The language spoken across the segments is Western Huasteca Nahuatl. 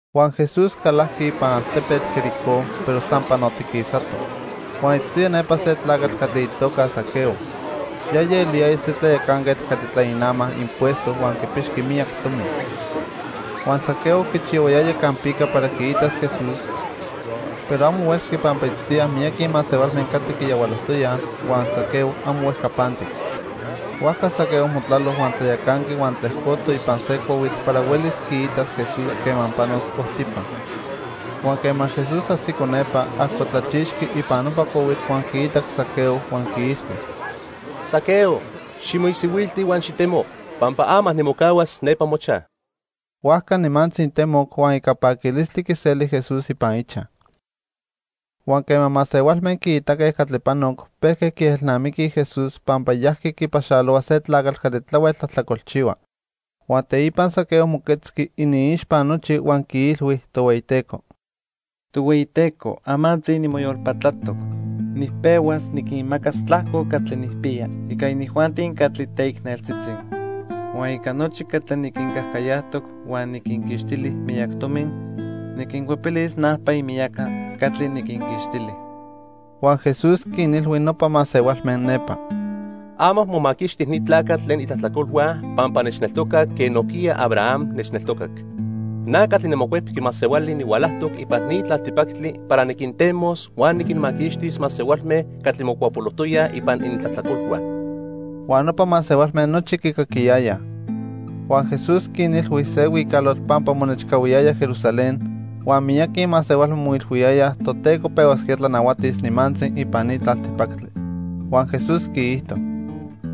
Huan Jesús calajqui ipan altepetl Jericó, pero san panotiquisato. Huan itztoya nepa se tlacatl catli itoca Zaqueo. Yaya eliyaya se tlayacanquetl catli tlainama impuesto huan quipixqui miyac tomi. Huan Zaqueo quichihuayaya campica para quiitas Jesús, pero amo huelqui pampa itztoyaj miyaqui masehualme catli quiyahualojtoyaj, huan Zaqueo amo huejcapantic. Huajca Zaqueo motlalo huan tlayacanqui huan tlejcoto ipan se cuahuitl para huelis quiitas Jesús quema panos ojtipa. Huan quema Jesús ajsico nepa, ajcotlachixqui ipan nopa cuahuitl huan quiitac Zaqueo huan quiilhui: —Zaqueo, ximoisihuilti huan xitemo, pampa ama nimocahuas nepa mochaj. Huajca nimantzi temoc, huan ica paquilistli quiseli Jesús ipan ichaj. Huan quema masehualme quiitaque catli panoc, pejque quiejelnamiquij Jesús pampa yajqui quipaxalohua se tlacatl catli tlahuel tlajtlacolchihua. Huan teipa Zaqueo moquetzqui iniixpa nochi huan quiilhui Tohueyiteco: —Tohueyiteco, amantzi nimoyolpatlatoc. Nipehuas niquinmacas tlajco catli nijpiya ica inijuanti catli teicneltzitzi. Huan ica nochi catli niquincajcayajtoc huan niquinquixtili miyac tomi, niquincuepilis najpa imiyaca catli niquinquixtili. Huan Jesús quinilhui nopa masehualme nepa: —Ama momaquixti ni tlacatl tlen itlajtlacolhua pampa nechneltocac quen nojquiya Abraham nechneltocac. Na catli niMocuepqui Masehuali nihualajtoc ipan ni tlaltipactli para niquintemos huan niquinmaquixtis masehualme catli mocuapolojtoyaj ipan inintlajtlacolhua. Huan nopa masehualme nochi quicaquiyayaj. Huan Jesús quinilhui se huicalotl pampa monechcahuiyaya Jerusalén, huan miyaqui masehualme moilhuiyayaj Toteco pehuasquía tlanahuatis nimantzi ipan ni tlaltipactli. Huan Jesús quiijto: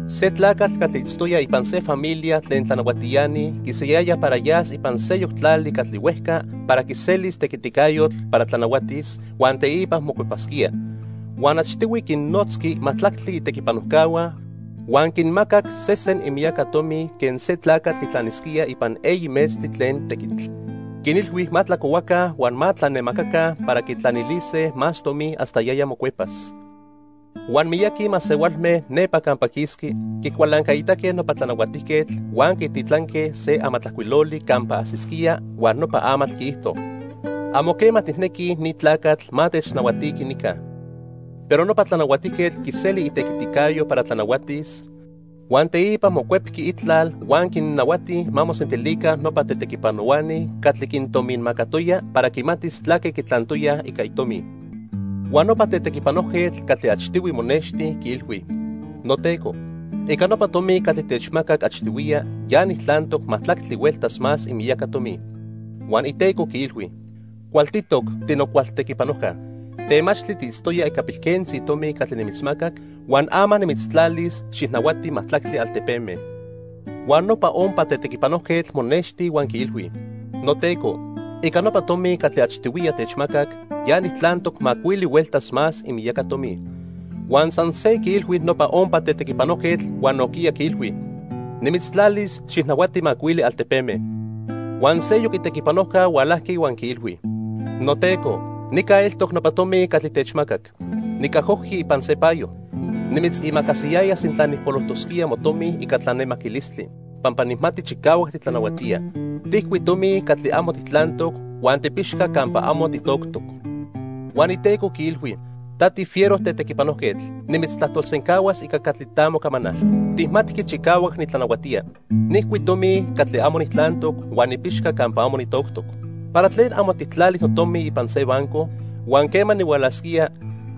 "Se tlacatl catli itztoya ipan se familia tlen tlanahuatiani quisayaya para yas ipan seyoc tlali catli huejca para quiselis tequiticayotl para tlanahuatis, huan teipa mocuepasquía. Huan achtihui quinnotzqui majtlactli itequipanojcahua huan quinmacac sesen imiyaca tomi quen se tlacatl quitlanisquía ipan eyi metztli tlen tequitl. Quinilhui ma tlacohuaca huan ma tlanemacaca para quitlanilise más tomi hasta yaya mocuepas. Huan miyaqui masehualme nepa campa quisqui quicualancaitaque nopa tlanahuatijquetl huan quititlanque se amatlajcuiloli campa ajsisquía huan nopa amatl quiijto: 'Amo quema tijnequij ni tlacatl ma technahuatiqui nica.' "Pero nopa tlanahuatijquetl quiseli itequiticayo para tlanahuatis, huan teipa mocuepqui itlal huan quinnahuati ma mosentilica nopa tetequipanohuani catli quintominmacatoya para quimatis tlaque quitlantoyaj ica itomi. Huan nopa tetequipanojquetl catli achtihui monexti, quiilhui: 'Noteco, ica nopa tomi catli techmacac achtihuiya ya nijtlantoc majtlactli hueltas más imiyaca tomi.' Huan iteco quiilhui: 'Cualtitoc, tinocualtequipanojca. Temachtli tiitztoya ica pilquentzi tomi catli nimitzmacac, huan ama nimitztlalis xijnahuati majtlactli altepeme.' Huan nopa ompa tetequipanojquetl monexti huan quiilhui: 'Noteco, ica nopa tomi catli achtihuiya techmacac, ya nijtlantoc macuili hueltas más imiyaca tomi.' Huan san se quiilhui nopa ompa tetequipanojquetl huan nojquiya quiilhui: 'Nimitztlalis xijnahuati macuili altepeme.' "Huan seyoc itequipanojca hualajqui huan quiilhui: 'Noteco, nica eltoc nopa tomi catli techmacac. Nicajojqui ipan se payo. Nimitzimacasiyaya sintla nijpolojtosquía motomi ica tlanemaquilistli, pampa nijmati chicahuac titlanahuatía. Tijcui tomi catli amo tijtlantoc huan tipixca campa amo titoctoc.' Huan iteco quiilhui: 'Ta tifiero tetequipanojquetl, nimitztlajtolsencahuas ica catli ta mocamanal. Tijmatqui chicahuac nitlanahuatía. Nijcui tomi catli amo nijtlantoc huan nipixca campa amo nitoctoc. ¿Para tlen amo tijtlali notomi ipan se banco, huan quema nihualasquía,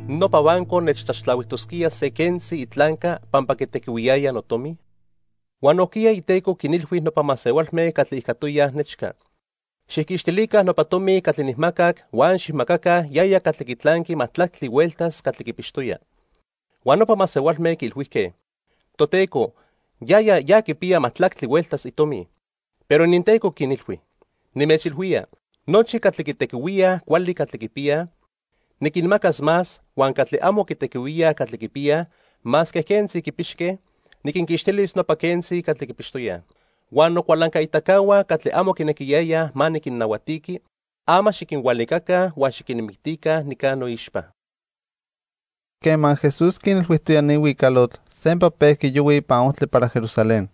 nopa banco nechtlaxtlahuijtosquía se quentzi itlanca pampa quitequihuiyaya notomi?' "Huan nojquiya iteco quinilhui nopa masehualme catli ijcatoyaj nechca: 'Xijquixtilica nopa tomi catli nijmacac huan xijmacaca yaya catli quitlanqui majtlactli hueltas catli quipixtoya.' Huan nopa masehualme quiilhuijque: 'Toteco, yaya ya quipiya majtlactli hueltas itomi.' "Pero ininteco quinilhui: 'Nimechilhuía, nochi catli quitequihuíaj cuali catli quipiyaj, niquinmacas más, huan catli amo quitequihuía catli quipiyaj, masque quentzi quipixque, niquinquixtilis nopa quentzi catli quipixtoyaj. Huan nocualancaitacahua catli amo quinequiyayaj ma niquinnahuatiqui, ama xiquinhualicaca huan xiquinmictica nica noixpa.' " Quema Jesús quinilhuijtoya ni huicalotl, sempa pejqui yohui ipan ojtli para Jerusalén.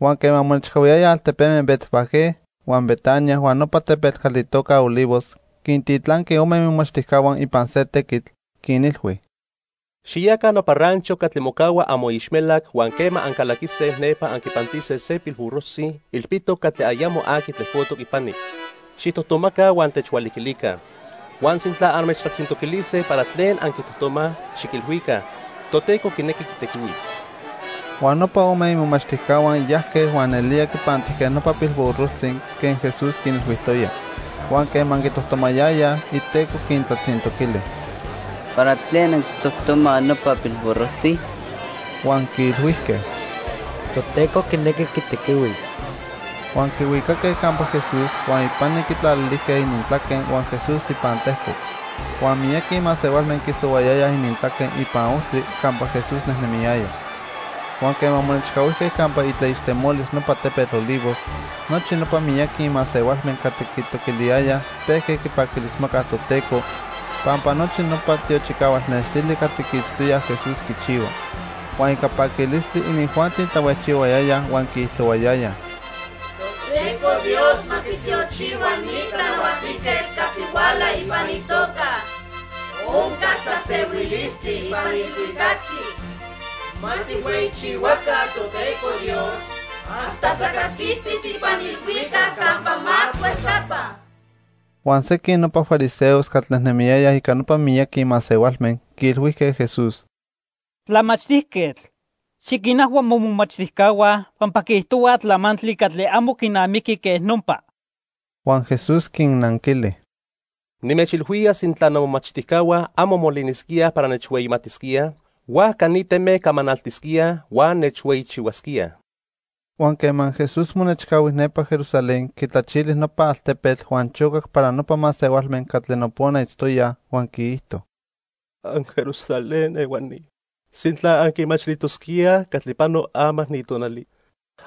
Huan quema monechcahuiyaya altepeme Betfagé huan Betania huan nopa tepetl catli itoca Olivos, quintitlanqui ome imomachtijcahua ipan se tequitl, quinilhui: —Xiyaca nopa rancho catli mocahua amoixmelac huan quema ancalaquise nepa anquipantise se pilburrojtzi ilpitoc catli ayamo aqui tlejcotoc ipani. Xijtojtomaca huan techhualiquilica. Huan sintla anmechtlatzintoquilise para tlen anquitojtomaj, xiquilhuica: 'Toteco quinequi quitequihuis.' Huan nopa ome imomachtijcahua yajque huan nelía quipantijque nopa pilburrojtzi quen Jesús quinilhuijtoya. Huan quema quitojtomayayaj, iteco quintlatzintoquili: —¿Para tlen anquitojtomaj nopa pilburrojtzi? Huan quiilhuijque: —Toteco quinequi quitequihuis. Huan quihuicaque campa Jesús, huan ipani quitlalilijque inintlaque huan Jesús ipan tlejcoc. Huan miyaqui masehualme quisohuayayaj inintlaque ipan ojtli campa Jesús nejnemiyaya. Huan quema monechcahuijque campa itlaixtemolis nopa tepetl Olivos, nochi nopa miyaqui masehualme catli quitoquiliyayaj pejque quipaquilismacaj Toteco pampa nochi nopa tiochicahual nextili catli quiitztoyaj Jesús quichihua. Huan ica paquilistli, inijuanti tlahuejchihuayayaj huan quiijtohuayayaj: "¡Toteco Dios ma quitiochihua ni tlanahuatijquetl catli huala ipan itoca! Oncas tlasehuilistli ipan ilhuicactli. ¡Ma tijhueyichihuaca Toteco Dios hasta tlacaquistis ipan ilhuicac campa más huejcapa!" Huan sequin nopa fariseos catli nejnemiyayaj ica nopa miyaqui masehualme quiilhuijque Jesús: —Tlamachtijquetl, xiquinajhua momomachtijcahua pampa quiijtohuaj tlamantli catli amo quinamiqui quej nopa. Huan Jesús quinnanquili: —Nimechilhuía sintla nomomachtijcahua amo molinisquíaj para nechhueyitlalisquíaj, huajca ni teme camanaltisquíaj huan nechhueyichihuasquíaj. Huan quema Jesús monechcahui nepa Jerusalén, quitlachili nopa altepetl huan chocac para nopa masehualme catli nopona itztoyaj, huan quiijto: "AnJerusalén ehuani, sintla anquimachilijtosquíaj catli pano ama ni tonali,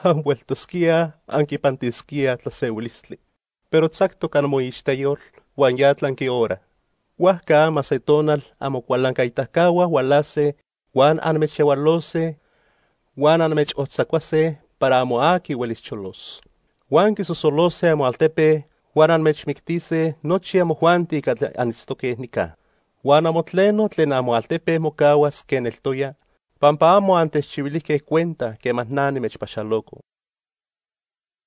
anhueltosquíaj anquipantisquíaj tlasehuilistli. Pero tzactoc amoixteyol huan ya tlanqui hora. Huajca ama se tonal amocualancaitacahua hualase huan anmechyahualose huan anmechojtzacuase para amo aqui huelis cholos. Huan quisosolose amoaltepe huan anmechmictise nochi amojuanti catli anitztoque nica. Huan amo tleno tlen amoaltepe mocahuas quen eltoya, pampa amo antechchihuilijque cuenta quema na nimechpaxaloco."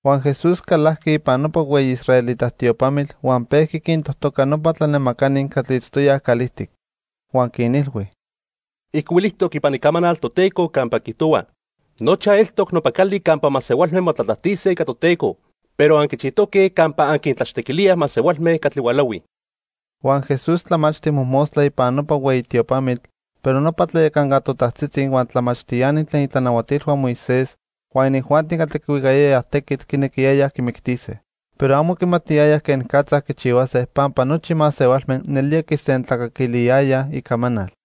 Huan Jesús calajqui ipan nopa hueyi israelita tiopamitl huan pejqui quintojtoca nopa tlanemacani catli itztoyaj calijtic. Huan quinilhui: —Ijcuilijtoc ipan Icamanal Toteco campa quiijtohua: 'Nochaj eltoc nopa cali campa masehualme motlatlajtise ica Toteco.' Pero anquichijtoque campa anquintlachtequilíaj masehualme catli hualahuij. Huan Jesús tlamachti mojmostla ipan nopa hueyi tiopamitl, pero nopa tlayacanca totajtzitzi, huan tlamachtiani tlen itlanahuatilhua Moisés, huan inijuanti catli quihuicayayaj tequitl quinequiyayaj quimictise. Pero amo quimatiyayaj quenicatza quichihuase pampa nochi masehualme nelía quisentlacaquiliyayaj icamanal.